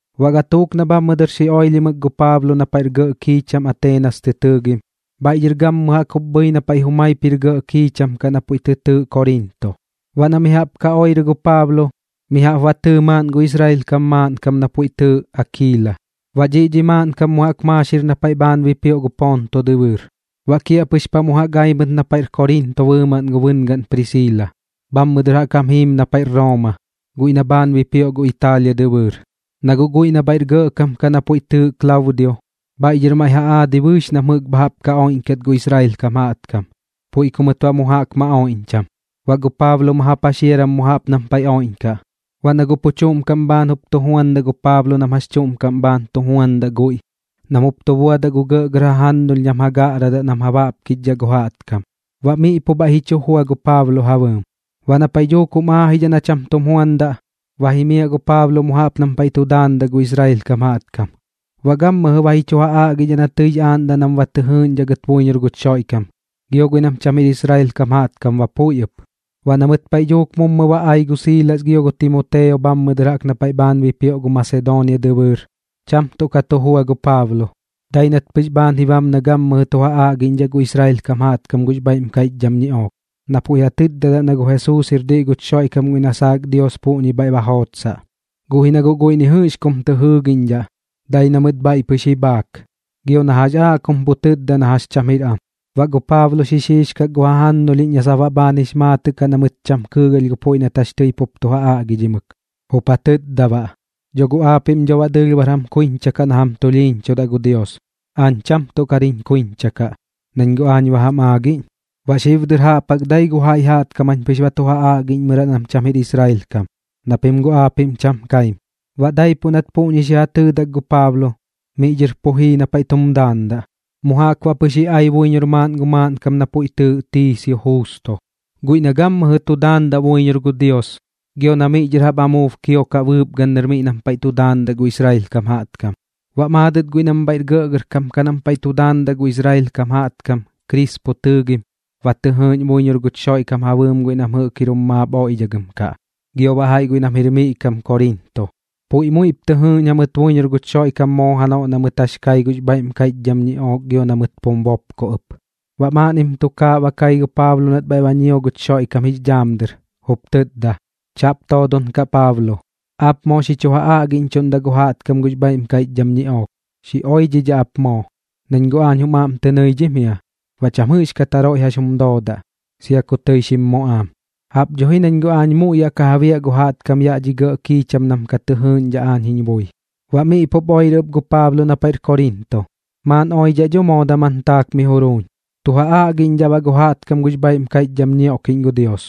Baꞌ gatuuk na bhammɨ dɨr xi oilhimɨk gu Paablo na paiꞌr gɇꞌ kiicham Ateenas tɨ tɨɨgim, bhaiꞌ dhɨr gammɨjɨ jaꞌk jup bhɨi na paiꞌ jumaip jir gɇꞌ kiicham kaꞌ na puiꞌ tɨ tɨɨꞌ Koriinto. Baꞌ na mi jaꞌp ka oirɨ gu Paablo, mi jaꞌp ba tɨɨ maaꞌn gu Israel kam maaꞌnkam na puiꞌ tɨɨꞌ Akiila. Baꞌ dhiꞌ dhi maaꞌnkam mu jaꞌk maaxir na paiꞌ bhaan bipioꞌ gu Ponto dɨbɨɨr, baꞌ kiaꞌpɨx paꞌ mu jaꞌp ai mɨt na paiꞌr Koriinto bɨɨmaꞌn gu bɨngaꞌn Prisiila. Bhammɨ dɨr jaꞌk jam jiim na paiꞌr Rooma, guiꞌ na bhaan bipioꞌ gu Italia dɨbɨɨr, na guꞌ guiꞌ na bhaiꞌr gɇꞌkam kaꞌ na puiꞌ tɨɨꞌ Klaudio, bhaiꞌ dhɨr maiꞌ ja aadi bɨɨx nam jɨꞌk bha jaꞌp ka oiꞌñkat gu Israel kam jaꞌtkam, puiꞌ ku mɨt baꞌ mu jaꞌk ma oiꞌñcham. Baꞌ gu Paablo ma ja paxiaram mu jaꞌp nam paiꞌ oiꞌñkaꞌ. Baꞌ na guꞌ pu chuꞌm kaꞌm bhaan jup tu juandaꞌ gu Paablo nam jax chuꞌm kaꞌm bhaan tu juandaꞌ guiꞌ, nam jup tu buadaꞌ gu gɇꞌgɇr jajannulh nam ja gaꞌradaꞌ nam ja baꞌkichdhaꞌ gu jaꞌtkam, baꞌ miꞌ pu bhaiꞌ ji chu jua gu Paablo ja bɨɨm. Baꞌ na paiꞌ dhuuk jum aajidhaꞌ na cham tum juandaꞌ, ba jimiaꞌ gu Paablo mu jaꞌp nam paiꞌ tu daandaꞌ gu Israel kam jaꞌtkam. Baꞌ gammɨjɨ ba ji chu ja aꞌgidhaꞌ na tɨix aaꞌndaꞌ nam ba tɨ jɨɨꞌñdhaꞌ gɨt buiñor guch Xoiꞌkam, gio guiꞌ nam cham jir Israel kam jaꞌtkam ba puiꞌ ɨp. Baꞌ na mɨt paiꞌ dhuuk mummɨ ba ai gu Siilas gio gu Timoteo bhammɨ dɨr jaꞌk na paiꞌ bhaan bipioꞌ gu Masedoonia dɨbɨɨr, cham tuꞌ ka tu jua gu Paablo, dai nat pɨx bhaan ji bam na gammɨjɨ tu ja aꞌgiꞌñdhaꞌ gu Israel kam jaꞌtkam gux bhaiꞌm kaiꞌchdham ñiꞌook, na puiꞌ ja tɨtdadaꞌ na gu Jesuus jir diꞌ guch Xoiꞌkam guiꞌ na saak Dios puꞌñi bhaiꞌ ba jootsaꞌ. Guꞌ ji na guꞌ guiꞌ ni jɨꞌx kum tɨ jɨɨgiꞌñdhaꞌ, dai na mɨt bhaiꞌ pɨx ji bhaak, gio na jax aaꞌ kum pu tɨtda na jax cham jir am. Baꞌ gu Paablo xixiixkak gu jajannulhiꞌñ na sap baꞌ bhaan jix maatɨꞌ kaꞌ na mɨt cham kɨɨgalh gu puiꞌ na jax tɨi pup tu ja aꞌgidhimɨk, jup ja tɨtda baꞌ: ―Dho guꞌ aapiꞌm dho baꞌ dɨɨlh bar jam kuiñcha kaꞌ na jam tulhiiñchudaꞌ gu Dios, aañ cham tuꞌ kar jiñ kuiñcha kaꞌ, nañ guꞌ aañ ba jam aagiꞌñ. Baꞌ xib dɨr jaꞌp jaꞌk dai gu jaiꞌ jaꞌtkam jañ pɨx ba tu ja aꞌgiꞌñmɨraꞌ nam cham jir Israel kam, na pim guꞌ aapiꞌm cham kaim. Baꞌ daipuꞌ nat puꞌñi xi ja tɨɨdak gu Paablo, miꞌ dhɨr pu jii na paiꞌ tum daandaꞌ, mu jaꞌk baꞌ pɨx ji ai buiñor maaꞌn gu maaꞌnkam na puiꞌ tɨɨꞌ Tiisio Juusto, guiꞌ na gammɨjɨ tu daandaꞌ buiñor gu Dios gio na miꞌ dhɨr jaꞌp amuub kiokaꞌ bɨɨpgan miꞌ nam paiꞌ tu daandaꞌ gu Israel kam jaꞌtkam. Baꞌ maadɨt guiꞌ nam bhaiꞌr gɇꞌgɇrkam kaꞌ nam paiꞌ tu daandaꞌ gu Israel kam jaꞌtkam Krispo tɨɨgim, ba tɨ jɨɨꞌñ buiñor guch Xoiꞌkam ja bɨɨm guiꞌ nam jɨꞌk jir jum maap oiꞌdhagɨm kaꞌ, gio baꞌ jaiꞌ guiꞌ nam jir miꞌ kam Koriinto. Puiꞌ muiꞌp tɨ jɨɨꞌñ jamɨt buiñor guch Xoiꞌkam moo janoꞌ na mɨt jax kai gux bhaiꞌm kaiꞌchdham ñiꞌook gio na mɨt pum bopko ɨp. Baꞌ maaꞌnnim tukaaꞌ ba kai gu Paablo nat bhaiꞌ ba ñio guch Xoiꞌkam jix dhaam dɨr, jup tɨtda: ―Chaꞌp toodon kaꞌ Paablo. Aap moo xi chu ja aꞌgiꞌñchuꞌndaꞌ gu jaꞌtkam gux bhaiꞌm kaiꞌchdham ñiꞌook, xi oidhidhaꞌ ap moo, nañ guꞌ aañ jum aꞌm tɨ nɨidhim jia. Baꞌ cham jɨꞌxkat jaroiꞌ jax jum doodaꞌ, sia ku tɨi xim muꞌaam, jaꞌp dho ji nañ guꞌ aañ muiꞌ yaꞌ ka ja biaꞌ gu jaꞌtkam yaꞌ dhi gɇꞌ kiicham nam ka tɨ jɨɨꞌñdhaꞌ aañ jiñ bui. Baꞌ miꞌ pup oirɨ ɨp gu Paablo na paiꞌr Koriinto, maaꞌn oiꞌdhaꞌ dho moo daman taak miꞌ juruuñ, tu ja aꞌgiꞌñdhaꞌ baꞌ gu jaꞌtkam gux bhaiꞌm kaiꞌchdham ñioꞌkiꞌñ gu Dios.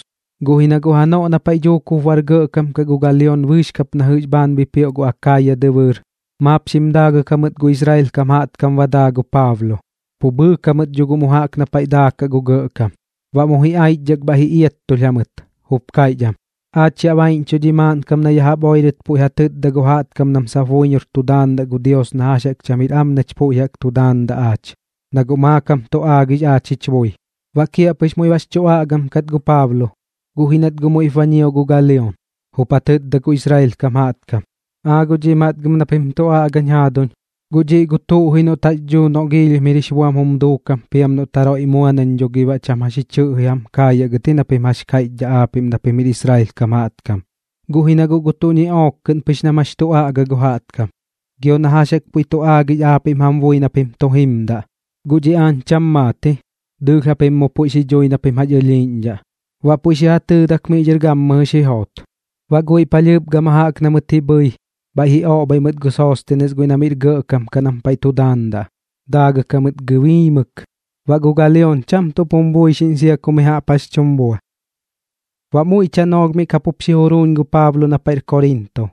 Guꞌ ji na guꞌ janoꞌ na paiꞌ dhuuk jup bar gɇꞌkam kaꞌ gu Galion bɨɨx kap na jɨꞌx bhaan bipioꞌ gu Akaaya dɨbɨɨr, maap xim daagɨk jamɨt gu Israel kam jaꞌtkam ba daa gu Paablo, pu bhɨɨk jamɨt dho guꞌ mu na paiꞌ daakaꞌ gu gɇꞌkam. Baꞌ mu ji aichdhak bhaiꞌ ji iattulh jamɨt, jup kaiꞌch am: ―Aach yaꞌ baiꞌñchuꞌ dhi maaꞌnkam na ya jaꞌp oirɨt puiꞌ ja tɨtda gu jaꞌtkam nam sap buiñor tu daandaꞌ gu Dios na jax jaꞌk cham jir am nach puiꞌ jaꞌk tu daandaꞌ aach, na guꞌ maakam tu aagix aach jich bui. Baꞌ kiaꞌpɨx muiꞌ bax chu aꞌgam kat gu Paablo, guꞌ ji nat guꞌ muiꞌp ba ñio gu Galion, jup ja tɨtda gu Israel kam jaꞌtkam: ―Aa guꞌ dhiꞌ matgɨm na pim tuꞌ aꞌgañ jaaduñ, guꞌ dhiꞌ gu tuꞌ ji noꞌt jax dhuu noꞌ giilhim jir jix buam jum duukam piam noꞌt jaroiꞌ mua nañ baꞌ dho gi cham jax ji chɨꞌji jam kaayaꞌ gɨt ji na pim jax kaiꞌchdhaꞌ aapiꞌm na pim jir Israel kam jaꞌtkam. Guꞌ ji na guꞌ gu tuꞌ ñiꞌook kɨꞌn pɨx nam jax tu aꞌga gu jaꞌtkam, gio na jax jaꞌk puiꞌ tu aagix aapiꞌm jam bui na pim tu jimdaꞌ, guꞌ dhiꞌ aañ cham maat ji, dɨɨlh japim mu puiꞌ xi dhui na pim jax ɨlhiiꞌñdhaꞌ. Baꞌ puiꞌ xi ja tɨɨdak miꞌ dhɨr gammɨjɨ xi joot. Baꞌ guiꞌ palhɨɨp gama jaꞌk na mɨt ji bhɨi, bhaiꞌ ji oꞌbhai mɨt gu Soostenes guiꞌ na miꞌr gɇꞌkam kaꞌ nam paiꞌ tu daandaꞌ, daagɨk jamɨt gɨbiimɨk. Baꞌ gu Galion cham tuꞌp jum buixiꞌñ sia ku mi jaꞌp jax chum bua. Baꞌ muiꞌ tanoolh miꞌ kapup xi juruuñ gu Paablo na paiꞌr Koriinto.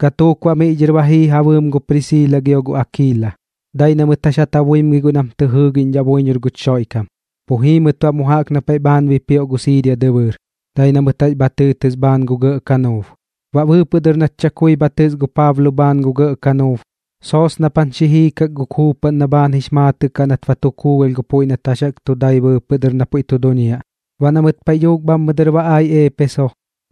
Gatuuk baꞌ miꞌ dhɨr ba jii ja bɨɨm gu Prisiila gio gu Akiila, dai na mɨt jax ja tabuimgi guiꞌ nam tɨ jɨɨgiꞌñdhaꞌ buiñor guch Xoiꞌkam. Pu jii mɨt baꞌ mu jaꞌk na paiꞌ bhaan bipioꞌ gu Siiria dɨbɨɨr, dai na mɨt jax bha tɨɨtɨs bhaan gu gɇꞌ kanuub. Baꞌ bɨɨpɨꞌ dɨr nat chakui bha tɨs gu Paablo bhaan gu gɇꞌ kanuub, soosnapan xi jiikak gu kuupaꞌn na baꞌ bhaan jix maatɨꞌ kaꞌ nat ba tu kuugalh gu puiꞌ nat jax jaꞌk tu dai bɨɨpɨꞌ dɨr na pu tu duñiaꞌ. Baꞌ na mɨt paiꞌ dhuuk bhammɨ dɨr ba ai Eepeso,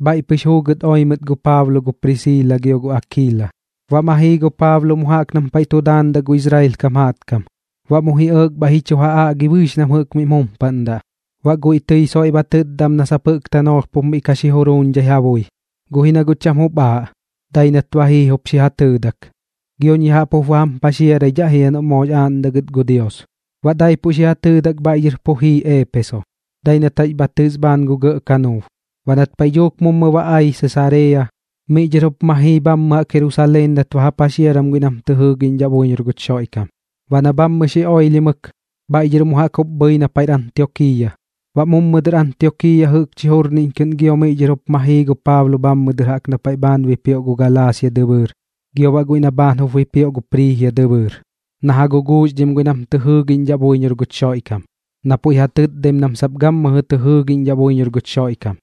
bhaiꞌ pɨx juugɨt oi mɨt gu Paablo gu Prisiila gio gu Akiila. Baꞌ ma jii gu Paablo mu jaꞌp nam paiꞌ tu daandaꞌ gu Israel kam jaꞌtkam, baꞌ mu ji ɇɇk bhaiꞌ ji chu ja aꞌgi bɨɨx nam jɨꞌk miꞌm jumpaꞌndaꞌ. Baꞌ guiꞌ tɨi soiꞌ ba tɨtda am na sap jɨꞌk tanoolh pup miꞌ ka xi juruuñdhai ja bui, guꞌ ji na guꞌ cham jup aaꞌ. Dai nat ba jii jup xi ja tɨɨdak: ―Gioñ ya jaꞌp jup ba jam paxiaraidhaꞌ jia noꞌ moox aaꞌndaꞌ gɨt gu Dios. Baꞌ daipuꞌ xi ja tɨɨdak bhaiꞌ dhɨr pu jii Eepeso, dai nat jax bha tɨs bhaan gu gɇꞌ kanuub. Baꞌ nat paiꞌ dhuuk mummɨ ba ai Sesareeya, miꞌ dhɨr jup ma jii bhammɨ jaꞌk Jerusaleen nat ba ja paxiaram guiꞌ nam tɨ jɨɨgiꞌñdhaꞌ buiñor guch Xoiꞌkam. Baꞌ na bhammɨ xi oilhimɨk, bhaiꞌ dhɨr mu jaꞌk jup bhɨi na paiꞌr Antiokiiya. Baꞌ mummɨ dɨr Antiokiiya jɨꞌkchi jurniꞌñ kɨꞌn miꞌ dhɨr giop ma jii gu Paablo bhammɨ dɨr jaꞌp na paiꞌ bhaan bipioꞌ gu Galaasia dɨbɨɨr gio baꞌ guiꞌ na bhaan jup bipioꞌ gu Priijia dɨbɨɨr na ja guguuxdhim guiꞌ nam tɨ jɨɨgiꞌñdhaꞌ buiñor guch Xoiꞌkam, na puiꞌ ja tɨtdaim nam sap gammɨjɨ tɨ jɨɨgiꞌñdhaꞌ buiñor guch Xoiꞌkam.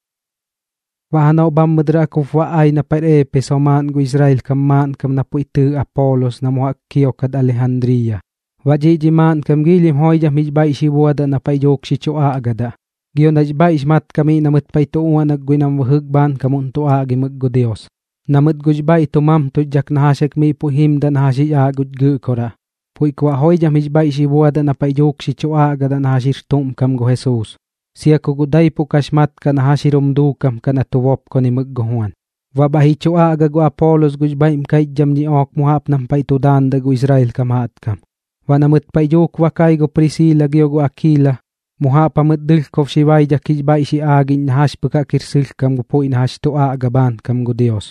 Baꞌ janoꞌ bhammɨ dɨr jaꞌk jup ba ai na paiꞌr Eepeso maaꞌn gu Israel kam maaꞌnkam na puiꞌ tɨɨꞌ Apoolos na mu jaꞌk kiokat Alijandriiya. Baꞌ dhiꞌ dhi maaꞌnkam joidham jix bhaiꞌ xi buadaꞌ na paiꞌ dhuuk xi chu aꞌgadaꞌ, gio nax bhaiꞌx mat kaꞌ miꞌ na mɨt paiꞌ tu uaꞌnak guiꞌ nam bɨjɨk bhaankamuꞌn tu aꞌgimɨk gu Dios. Na mɨt guꞌx bhaiꞌ tu mamtuxdhak na jax jaꞌk miꞌ puiꞌ jiimdaꞌ na jax jix aaꞌ guch Gɨꞌkoraꞌ, puiꞌ ku baꞌ joidham jix bhaiꞌ xi buadaꞌ na paiꞌ dhuuk xi chu aꞌgadaꞌ na jax jir tuꞌm kam gu Jesuus, sia ku guꞌ daipuꞌ kax mat kaꞌ na jax jir jum duukam kaꞌ na tu bopkonaimɨk gu Juan. Baꞌ bhaiꞌ ji chu aꞌga gu Apoolos gux bhaiꞌm kaiꞌchdham ñiꞌook mu jaꞌp nam paiꞌ tu daandaꞌ gu Israel kam jaꞌtkam. Baꞌ na mɨt paiꞌ dhuuk ba kai gu Prisiila gio gu Akiila, mu jaꞌp jamɨt dɨlhkob xi baidhak jix bhaiꞌ xi aagiꞌñ na jax pɨk jaꞌk jir sɨlhkam gu puiꞌ na jax tu aꞌga bhaankam gu Dios.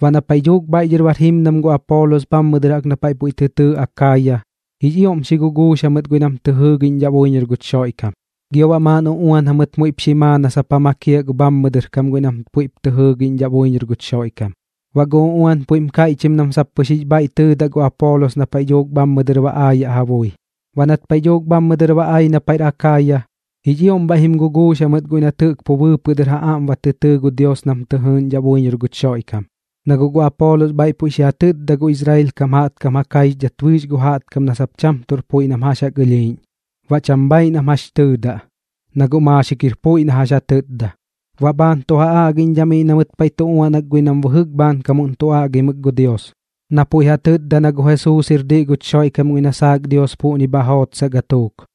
Baꞌ na paiꞌ dhuuk bhaiꞌ dhɨr bar jimdam gu Apoolos bhammɨ dɨr jaꞌk na paiꞌ puiꞌ tɨ tɨɨꞌ Akaaya, jix ioꞌm xi guguux jamɨt guiꞌ nam tɨ jɨɨgiꞌñdhaꞌ buiñor guch Xoiꞌkam, gio baꞌ maaꞌn uꞌuan jamɨt muiꞌp xi maa na sap ja makiaꞌ gu bhammɨ dɨr kam guiꞌ nam puiꞌp tɨ jɨɨgiꞌñdhaꞌ buiñor guch Xoiꞌkam. Baꞌ gu uꞌuan puiꞌm kaiꞌchim nam sap pɨx jix bhaiꞌ tɨɨdaꞌ gu Apoolos na paiꞌ dhuuk bhammɨ dɨr ba aayaꞌ ja bui. Baꞌ nat paiꞌ dhuuk bhammɨ dɨr ba ai na paiꞌr Akaaya, jix ioꞌm bhaiꞌ jim guguux jamɨt guiꞌ nat jɨꞌk pu bɨɨpɨꞌ dɨr ja aꞌm ba tɨ tɨɨ gu Dios nam tɨ jɨɨꞌñdhaꞌ buiñor guch Xoiꞌkam, na guꞌ gu Apoolos bhaiꞌ puiꞌ xi ja tɨtda gu Israel kam jaꞌtkam ja kaixdhat bɨɨx gu jaꞌtkam na sap cham tuꞌr puiꞌ nam jax jaꞌk ɨlhiiꞌñ. Baꞌ cham bhaaiꞌ nam jax tɨɨdaꞌ, na guꞌ maaxik jir puiꞌ na jax ja tɨtda. Baꞌ bhaan tu ja aꞌgiꞌñdhaꞌ miꞌ na mɨt paiꞌ tu uaꞌnak guiꞌ nam bɨjɨk bhaankamuꞌn tu aꞌgimɨk gu Dios na puiꞌ ja tɨtdadaꞌ na gu Jesuus jir diꞌ guch Xoiꞌkam guiꞌ na saak Dios puꞌñi bha jootsaꞌ gatuuk.